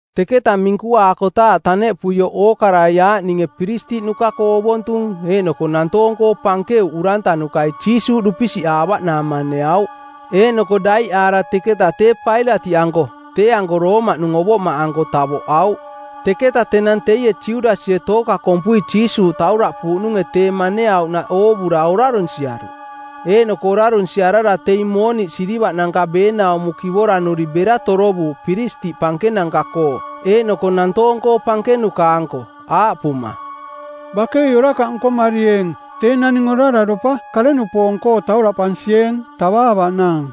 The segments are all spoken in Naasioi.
Teketa minkuaakotaaꞌ taneꞌpuioꞌ ookarai aaꞌninge piristiꞌnuka-koo ovontung eeꞌnoko nantoong-koo pankeuꞌ urantanukai Jiisuuꞌ dupisiꞌaavaꞌnaang maneauꞌ. Eeꞌnoko daiꞌaara teketa tee Pailatiꞌanko, tee-anko Roomaꞌnung ovoꞌmaꞌanko, tavoꞌauꞌ. Teketa tenang teie Judasie tooka kompui Jiisuuꞌ tauraꞌpuuꞌnunge tee maneauꞌnaꞌ oovura orarunsiaruꞌ. Eeꞌnoko orarunsiarara teing mooniꞌ silivaꞌnanka beenaumo kivora-nuri bera torovuuꞌ piristiꞌ pankenanka-koo eeꞌnoko nantoong-koo pankenuka-anko aaꞌpuma, “Bakei orakaꞌ nkomarieeng! Tee naning orararopa kare-nupoong-koo tauraꞌpansieeng tavaavaꞌnaang.”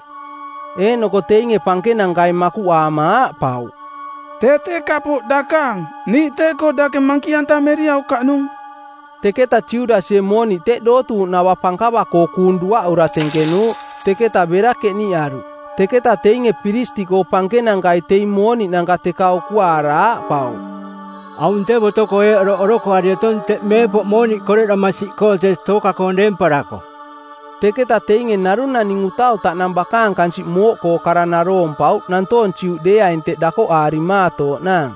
Eeꞌnoko teinge pankenankai makuꞌaama aaꞌpauꞌ, “Tee tee kapooꞌ dakaang, niiꞌ tee-koo dake mankiꞌantameriaukaꞌnung.” Teketa Judasie mooniꞌ teꞌ dootuuꞌnava pankava-koo kuung duaꞌura tenkenuuꞌ. Teketa bera keniꞌaruꞌ. Teketa teinge piristiꞌkoo pankenankai teing mooniꞌnanka teka ukuaara aaꞌpauꞌ, “Aung tee boto-koo eeꞌ oroꞌ orokoari otong teꞌ meepoꞌ mooniꞌ koreꞌdoma siꞌkoo tee tooka-koong deemparako.” Teketa teinge narung naning utau taꞌnang bakaang kansiꞌ mooꞌkoo kara naroompauꞌ nantoong Juꞌdeeaing teꞌ dakoꞌaarimaatooꞌnaang.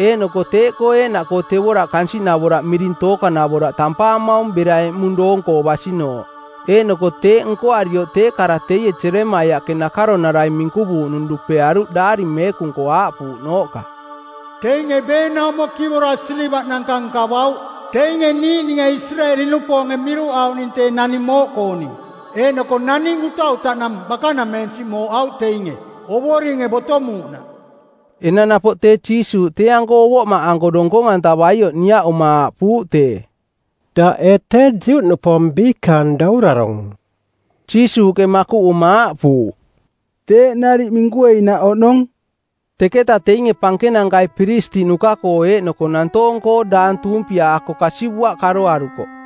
Eeꞌnoko teeꞌkoo eeꞌnaꞌkoo tevoraꞌ kansiꞌnavoraꞌ miring tookanavoraꞌ tampaamaung bera eꞌmung doonko basinooꞌ. Eeꞌnoko teeꞌ nkoarioꞌ tee kara teie Jeremaiaꞌke nakaronarai minkuvuuꞌnung dupearuꞌ Daari Meekung-koo aaꞌpuuꞌnooꞌka, “Teinge beenaumo kivora silivaꞌnanka nkavauꞌ, teinge niiꞌninge Isireeli-nupoonge miruꞌauꞌning tee naning mooꞌkooning. Eeꞌnoko naning utau taꞌnang bakanameensiꞌ mooꞌauꞌ teinge, Ovoringe botomuuꞌnaꞌ.” Enang napoꞌ tee Jiisuuꞌ tee-anko ovoꞌmaꞌanko donkong-antavaioꞌ niaꞌuma aaꞌpuuꞌ tee, “Daꞌ ee tee Juꞌnupoong biikaang daurarong?” Jiisuuꞌke makuꞌuma aaꞌpuuꞌ, “Teeꞌ nariꞌ minkueinaꞌ oꞌnong.” Teketa teinge pankenankai piristiꞌnuka-koo eeꞌnoko nantoong-koo daang tuumpiaako kasivuaꞌ karoarukoꞌ.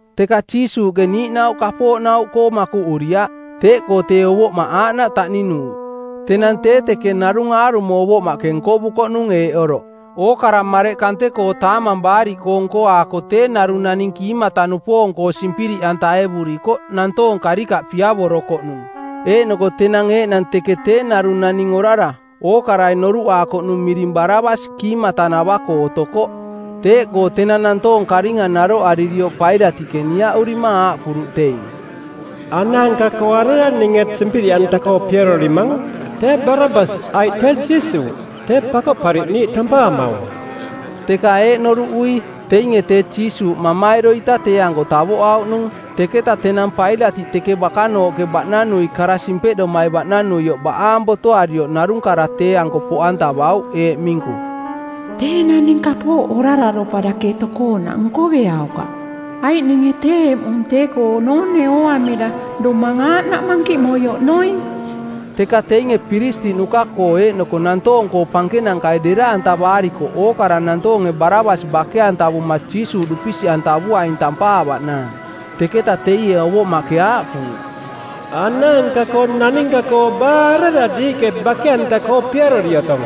Teka Jiisuuꞌke niiꞌnauꞌ kapooꞌnauꞌkoo makuꞌuriaꞌ. Teeꞌkoo tee ovoꞌmaꞌ aaꞌnaꞌ taꞌninuuꞌ. Tenang tee teke narung aarumo ovoꞌmaꞌke nkovukoꞌnung eeꞌ oroꞌ: Ookara mareꞌ kante-koo Taamang Baariꞌkoong˜ nkoaako tee narung naning kiimata-nupoong-koo simpiriꞌantaevurikoꞌ nantoong karikaꞌ piavorokoꞌnung. Eeꞌnoko tenang eeꞌnang teke tee narung naning orara, ookarai noruꞌaakoꞌnung miring Barabas kiimata-nava-koo otokoꞌ. Teeꞌkoo tenang nantoong karinga naroꞌaririoꞌ Pailatiꞌke niaꞌurima aaꞌpuruꞌ teing, “Anaanka-koo arera ninge simpiriꞌanta-koo piarorimang, tee Barabas aiꞌ tee Jiisuuꞌ, tee Pakoꞌpariꞌniiꞌ tampaamaung?” Teka eeꞌ noruꞌui, teinge tee Jiisuuꞌ mamairo-ita tee-anko tavoꞌauꞌnung. Teketa tenang Pailatiꞌ teke bakanooꞌke baꞌnanui kara simpeꞌdomai baꞌnanuioꞌ baꞌaang botoarioꞌ narung kara tee-anko poꞌantavauꞌ eeꞌ minku, “Tee naning kapooꞌ orararopa dake tokoonaꞌ nkoveaukaꞌ, aiꞌ ninge tee eꞌmung tee-koo noone ooamira domang aaꞌnaꞌ mankiꞌmoi oꞌnoing.” Teka teinge piristiꞌnuka-koo eeꞌnoko nantoong-koo pankenankai dera-antavaarikoꞌ ookara nantoonge Barabas bake-antavuma Jiisuuꞌ dupisiꞌantavuaing tampaavaꞌnaang. Teketa teie ovoꞌmaꞌke aaꞌpuuꞌ, “Anaanka-koo naninka-koo baa arera diiꞌke bake-anta-koo piarori otong?”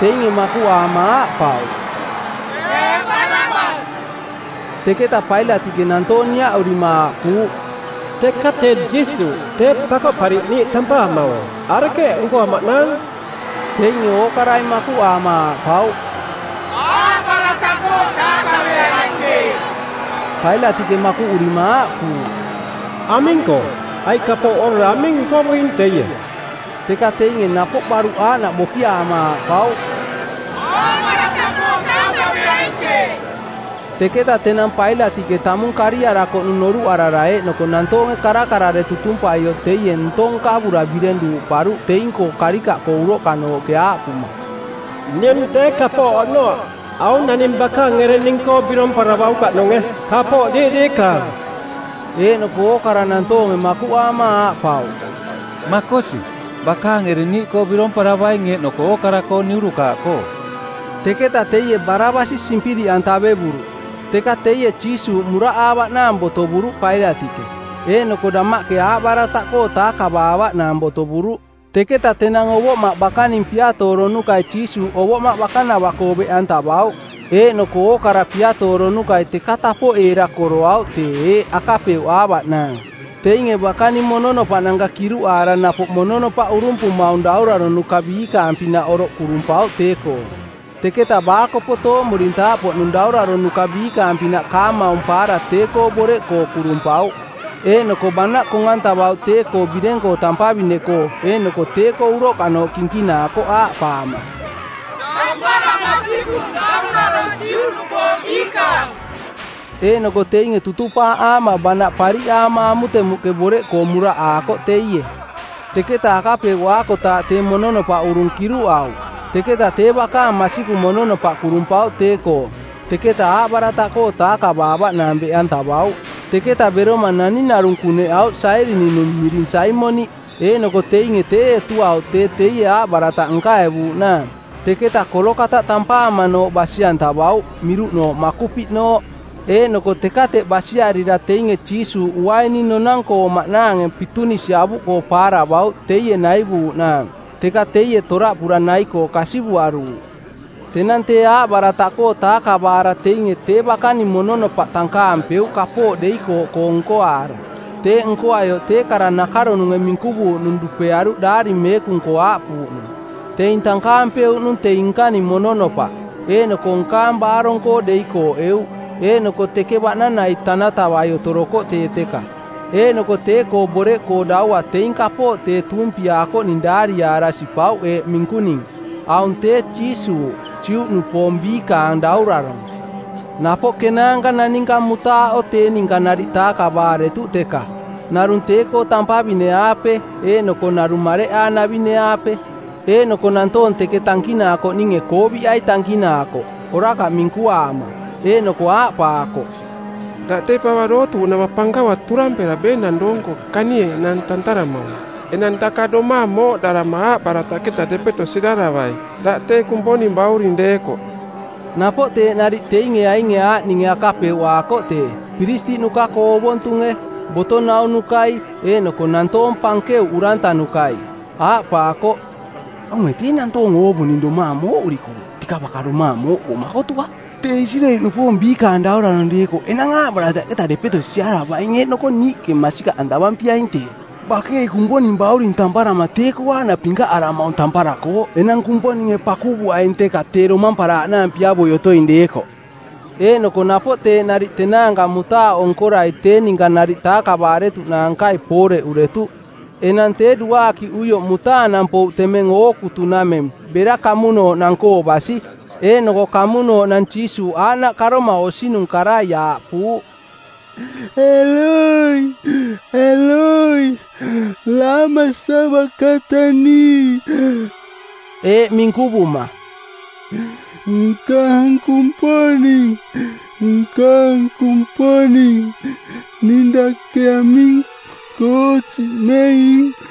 Teinge makuꞌaama aaꞌpauꞌ, “Tee Barabas.” Teketa Pailatiꞌke nantoong niaꞌurima aaꞌpuuꞌ, “Teka tee Jiisuuꞌ, tee Pakoꞌpariꞌniiꞌ tampaamaung, arekeeꞌ nkoamaꞌnaang?” Teinge ookarai makuꞌaama aaꞌpauꞌ, “Aaꞌbarataꞌkoo taakaveaing tee.” Pailatiꞌke makuꞌurima aaꞌpuuꞌ, “Aming-koo, aiꞌ kapooꞌ orara aming nkovuing teie?” Teka teinge napoꞌ baruꞌ aaꞌnaꞌ bokiaama aaꞌpauꞌ, “Aaꞌbarataꞌkoo taakaveaing tee.” Teketa tenang Pailatiꞌke tamung kariarakoꞌnung noruꞌarara eeꞌnoko nantoonge karakarare tutumpaioꞌ teie ntong nkavura bireng duuꞌparuꞌ teing-koo karikaꞌkoo uroꞌkanooꞌke aaꞌpuma, “Ning tee kapooꞌ oꞌnoaꞌ, aung naning bakaang ereng ning-koo biromparavaukaꞌnunge, kapooꞌ diiꞌ diikaang.” Eeꞌnoko ookara nantoonge makuꞌaama aaꞌpauꞌ, “Makosi, bakaang ereng niiꞌkoo biromparavaing eeꞌnoko ookara-koo niurukaaꞌkoo.” Teketa teie Barabasi simpiriꞌantavevuruꞌ. Teka teie Jiisuuꞌ muraꞌaavaꞌnaang botovuruꞌ Pailatiꞌke, eeꞌnoko damaꞌke aaꞌbarataꞌkoo taakavaavaꞌnaang botovuruꞌ. Teketa tenang ovoꞌmaꞌ bakaning piatooronukai Jiisuuꞌ ovoꞌmaꞌ bakanava-koo beꞌantavauꞌ, eeꞌnoko ookara piatooronukai teka tapoꞌeera koroauꞌ tee eeꞌ akapeuꞌaavaꞌnaang: Teinge bakaning mononopaꞌnanka kiruꞌaara napoꞌ mononopaꞌ urumpumaung dauraronuka biikaang-pinaꞌ oroꞌ kurumpauꞌ tee-koo. Teketa baakopo tooꞌmurintaaꞌpoꞌnung dauraronuka biikaang-pinaꞌ kaamaum paara tee-koo boreꞌkoo kurumpauꞌ. Eeꞌnoko banaꞌ kong-antavauꞌ tee-koo bireng-koo tampavine-koo eeꞌnoko tee-koo uroꞌkanooꞌ kinkinaakoꞌ aaꞌpaama, “Tampara masikung, Daurarong Juꞌnupoong Biikaang!” Eeꞌnoko teinge tutupaaꞌaama banaꞌ pariꞌaama amutemuꞌke boreꞌkoo muraꞌaakoꞌ teie. Teketa akapeuꞌaakotaaꞌ tee mononopaꞌ urung kiruꞌauꞌ, teketa tee bakaang masikung mononopaꞌ kurumpauꞌ tee-koo. Teketa aaꞌbarataꞌkoo taakavaavaꞌnaang beꞌantavauꞌ. Teketa beroma naning narung kuneꞌauꞌ Sairini-nung miring Saimoniꞌ, eeꞌnoko teinge tee etuauꞌ tee teie aaꞌbarataꞌ nkaevuuꞌnaang. Teketa Kolokataꞌ tampaamanooꞌ basi-antavauꞌ, miruꞌnooꞌ Makupiꞌnooꞌ. Eeꞌnoko teka teꞌ basiarira teinge Jiisuuꞌ uaini nonang-koong maꞌnaange pitunisi avuꞌkoo paaravauꞌ teie naivuuꞌnaang, teka teie toraꞌpura nai-koo kasivuaruuꞌ. Tenang tee aaꞌbarataꞌkoo taakavaara teinge tee bakaning mononopaꞌ tankaampeuꞌ kapooꞌ deikooꞌkoong nkoaara. Teeꞌ nkoaioꞌ tee kara nakaronunge minkuvuuꞌnung dupearuꞌ Daari Meekung-koo aaꞌpuuꞌnung, “Teing tankaampeuꞌnung teing nkaning mononopaꞌ, eeꞌnoko nkaang baarong-koo deikooꞌeuꞌ.” Eeꞌnoko teke baꞌnanai tanatavai otorokoꞌ tee teka. Eeꞌnoko tee-koo boreꞌkoo daua teing kapooꞌ tee tuumpiaakoꞌning daariaara sipauꞌ eeꞌ minkuning: AUNG TEE JIISUUꞌ, JUꞌNUPOONG BIIKAANG DAURARONG. Napoꞌ kenaanka naninka mutaaꞌo tee ninka nariꞌ taakavaaretuꞌ teka. Narung tee-koo tampavine-aape eeꞌnoko narung mareꞌaanavine-aape. Eeꞌnoko nantoong teke tankinaakoꞌninge kooviꞌai tankinaakoꞌ, orakaꞌ minkuaama. Eeꞌnoko aaꞌpaakoꞌ, “Daꞌ tee pava dootuuꞌnava pankava turampera beenang doong-koo kanieeꞌnaang tantaramaung, enang daka domaang mooꞌdarama aaꞌbarataꞌketa depeto siraravai, daꞌ tee Kumponing Bauring deekoꞌ.” Napoꞌ teeꞌ nariꞌ teinge ainge aaꞌninge akapeuꞌaakoꞌ tee, piristiꞌnuka-koo ovontunge, boto naunukai eeꞌnoko nantoong pankeuꞌ urantanukai. Aaꞌpaakoꞌ, “Aunge tee nantoong oovuning domaang mooꞌurikooꞌ, teka baka domaang mooꞌkoo makotuaꞌ. Tee Isireeli-nupoong Biikaang Daurarong deekoꞌ enang aaꞌbarataꞌketa depeto siaravaing eeꞌnoko niiꞌke masikaꞌantavampiaing tee. Bakei Kumponing bauring tamparama tee-koo aaꞌnaꞌ pinkaꞌaramaung tamparakooꞌ, enang Kumponinge pakuvuaing teka tee domamparaaꞌnaang piavoi otoing deekoꞌ.” Eeꞌnoko napoꞌ teeꞌ nariꞌ tenaanka mutaaꞌo nkorai tee ninka nariꞌ taakavaaretuꞌnaankai pooreꞌuretuꞌ. Enang tee duaakiꞌuioꞌ mutaanang pouꞌ temeng ookutunameng bera kamunooꞌnang-koo basi. Eeꞌnoko kamunooꞌnang Jiisuuꞌ aaꞌnaꞌ karoma osinung karai aaꞌpuuꞌ, “Eloi, Eloi, lama sabakatani,” eeꞌ minkuvuma, “Nkaang Kumponing, nkaang Kumponing, ning dake aming-koo siꞌmeing?”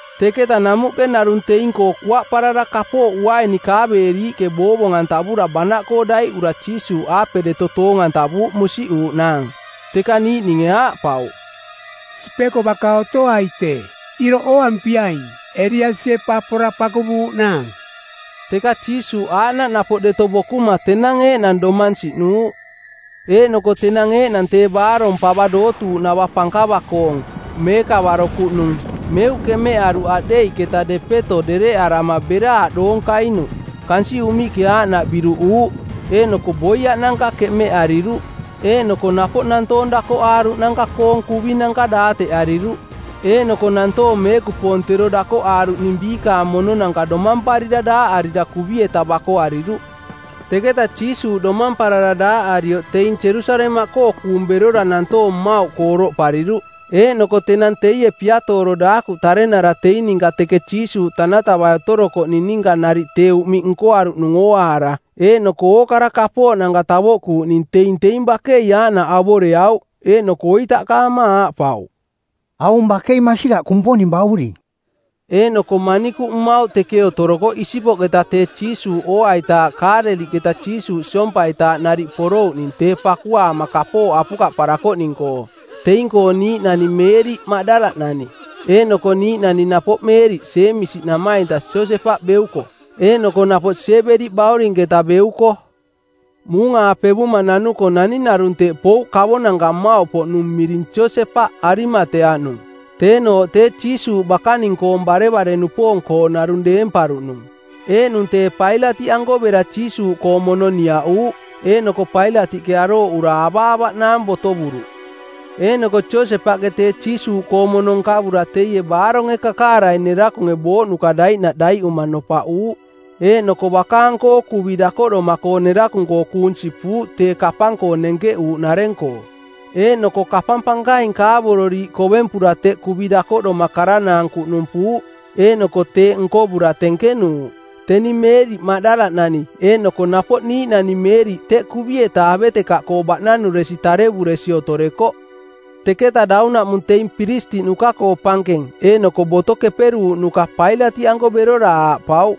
Teketa namuꞌke narung teing-koo kuaꞌparara kapooꞌ uaini kaaveeriiꞌke boovong-antavura banaꞌkoo daiꞌantavura Jiisuuꞌaape deto toong-antavuuꞌ musiꞌuuꞌnaang. Teka niiꞌninge aaꞌpauꞌ, “Sipeko baka otoai tee. Iroꞌ ooampiaing, Eliasie pa pora pakuvuuꞌnaang.” Teka Jiisuuꞌ aaꞌnaꞌ napoꞌ deto bokuma tenang eeꞌnang domang siꞌnuuꞌ. Eeꞌnoko tenang eeꞌnang tee baarong pava dootuuꞌnava pankava-koong, meekavaro kuꞌnung, meuꞌ keꞌmeꞌaruꞌ aꞌdeiꞌketa depeto dereꞌarama bera aꞌdoong kainuꞌ. Kansiꞌ uꞌmiꞌke aaꞌnaꞌ biruꞌuuꞌ, eeꞌnoko boiaꞌnanka keꞌmeraꞌariruꞌ. Eeꞌnoko napoꞌ nantoong dakoꞌaaruꞌnanka-koong kuvinanka daateꞌariruꞌ, eeꞌnoko nantoong meekupoong tero dakoꞌ aaruꞌning biikaang mononanka domamparira daaꞌarira kuvi-eta bakoariruꞌ; Teketa Jiisuuꞌ domamparara daaꞌarioꞌ teing Jerusalemaꞌkoo kuung berora nantoong mmauꞌkoo oroꞌpariruꞌ. Eeꞌnoko tenang teie piatooro daakuꞌ tarenara teing ninka teke Jiisuuꞌ tanatavai otorokoꞌning ninka nariꞌ tee uꞌmiꞌ nkoaruꞌnung ooaara eeꞌnoko ookara kapooꞌnanka tavoꞌkuuꞌning teing teing bakei aaꞌnaꞌ avoreauꞌ, eeꞌnoko oitaꞌkaama aaꞌpauꞌ, “Aung bakei masikaꞌ Kumponing Bauring.” Eeꞌnoko manikuꞌ mmauꞌ teke otorokoꞌ isipoꞌketa tee Jiisuuꞌ ooaitaaꞌ Kaaleliꞌketa Jiisuuꞌ siompaitaaꞌ nariꞌ porouꞌning tee pakuaama kapooꞌ apukaꞌparakoꞌning-koo. Teing-koo niiꞌnani Meeriꞌ Maꞌdala-nani, eeꞌnoko niiꞌnani napoꞌ Meeriꞌ Jeemisi namainta Josepaꞌ beuko, eeꞌnoko napoꞌ Siebedi baurinketa beuko. Muung-aapevuma nanuko naning narung teꞌ pouꞌ kavonanka mmauꞌpoꞌnung miring Josepaꞌ Arimateaꞌnung, teenooꞌ tee Jiisuuꞌ bakaning-koong barevare-nupoong-koo narung deemparuꞌnung. Eeꞌnung tee Pailatiꞌanko bera Jiisuuꞌkoong mono niaꞌuuꞌ, eeꞌnoko Pailatiꞌke arooꞌura avaavaꞌnaang botovuruꞌ. Eeꞌnoko Josepaꞌke tee Jiisuuꞌkoong mono nkavura teie baaronge kakaarai nerakunge booꞌnuka daiꞌnaꞌ daiꞌuma nopaꞌuuꞌ. Eeꞌnoko bakaang-koo kuvi dakoꞌdoma-koo nerakung-koo kuung sipuuꞌ tee kapang-koo nenkeꞌuuꞌnareng-koo. Eeꞌnoko kapang pankaing kaavororiiꞌ kovempura teꞌ kuvi dakoꞌdoma karanaang kuꞌnumpuuꞌ, eeꞌnoko teeꞌ nkovura tenkenuuꞌ. Teni Meeriꞌ Maꞌdala-nani eeꞌnoko napoꞌ niiꞌnani Meeriꞌ teꞌ kuvi-eta avetekaꞌkoo baꞌnanuresi tarevuresi otorekoꞌ. Teketa daunaꞌmung teing piristiꞌnuka-koo pankeng eeꞌnoko Boto Keperuuꞌnuka Pailatiꞌanko berora aaꞌpauꞌ,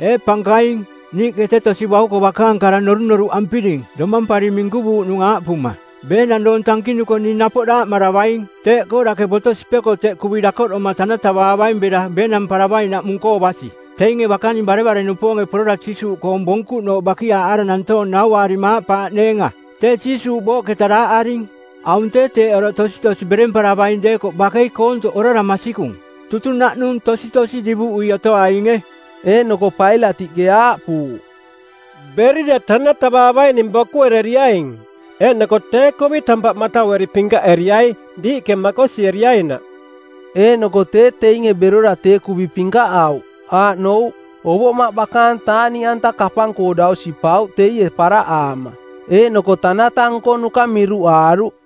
“Ee pankaing, niiꞌke tee tosi bauko bakaang kara norunoruꞌampiring domampari minkuvuuꞌnung aaꞌpuma, ‘Beenang doong tankinuko ning napoꞌ daaꞌmaravaing.’ Teeꞌkoo dake boto sipeko teꞌ kuvi dakoꞌdoma tanatavaavaing bera beenamparavainaꞌmung-koo basi, teinge bakaning barevare-nupoonge porora Jiisuuꞌkoong bonkuꞌnooꞌ bakiaaꞌaara nantoong nauaarima aaꞌpaaꞌneenga, ‘Tee Jiisuuꞌ booꞌketa daaꞌaring.’ Aung tee teeꞌ oroꞌ tositosi beremparavaing deekoꞌ bakei koontoꞌ orara masikung, tutunaꞌnung tositosi divuꞌui otoainge.” Eeꞌnoko Pailatiꞌke aaꞌpuuꞌ, “Berira tanatavaavaining bokuereriaing, eeꞌnoko tee kuvi tampaꞌ mataueri pinkaꞌeriai diiꞌke makosieriainaꞌ.” Eeꞌnoko tee teinge berora tee kuvi pinkaꞌauꞌ, aaꞌnouꞌ, ovoꞌmaꞌ bakaang taaꞌniꞌanta kapang-koo dau sipauꞌ teie paraꞌaama, eeꞌnoko tanata nkonuka miruꞌaaruꞌ.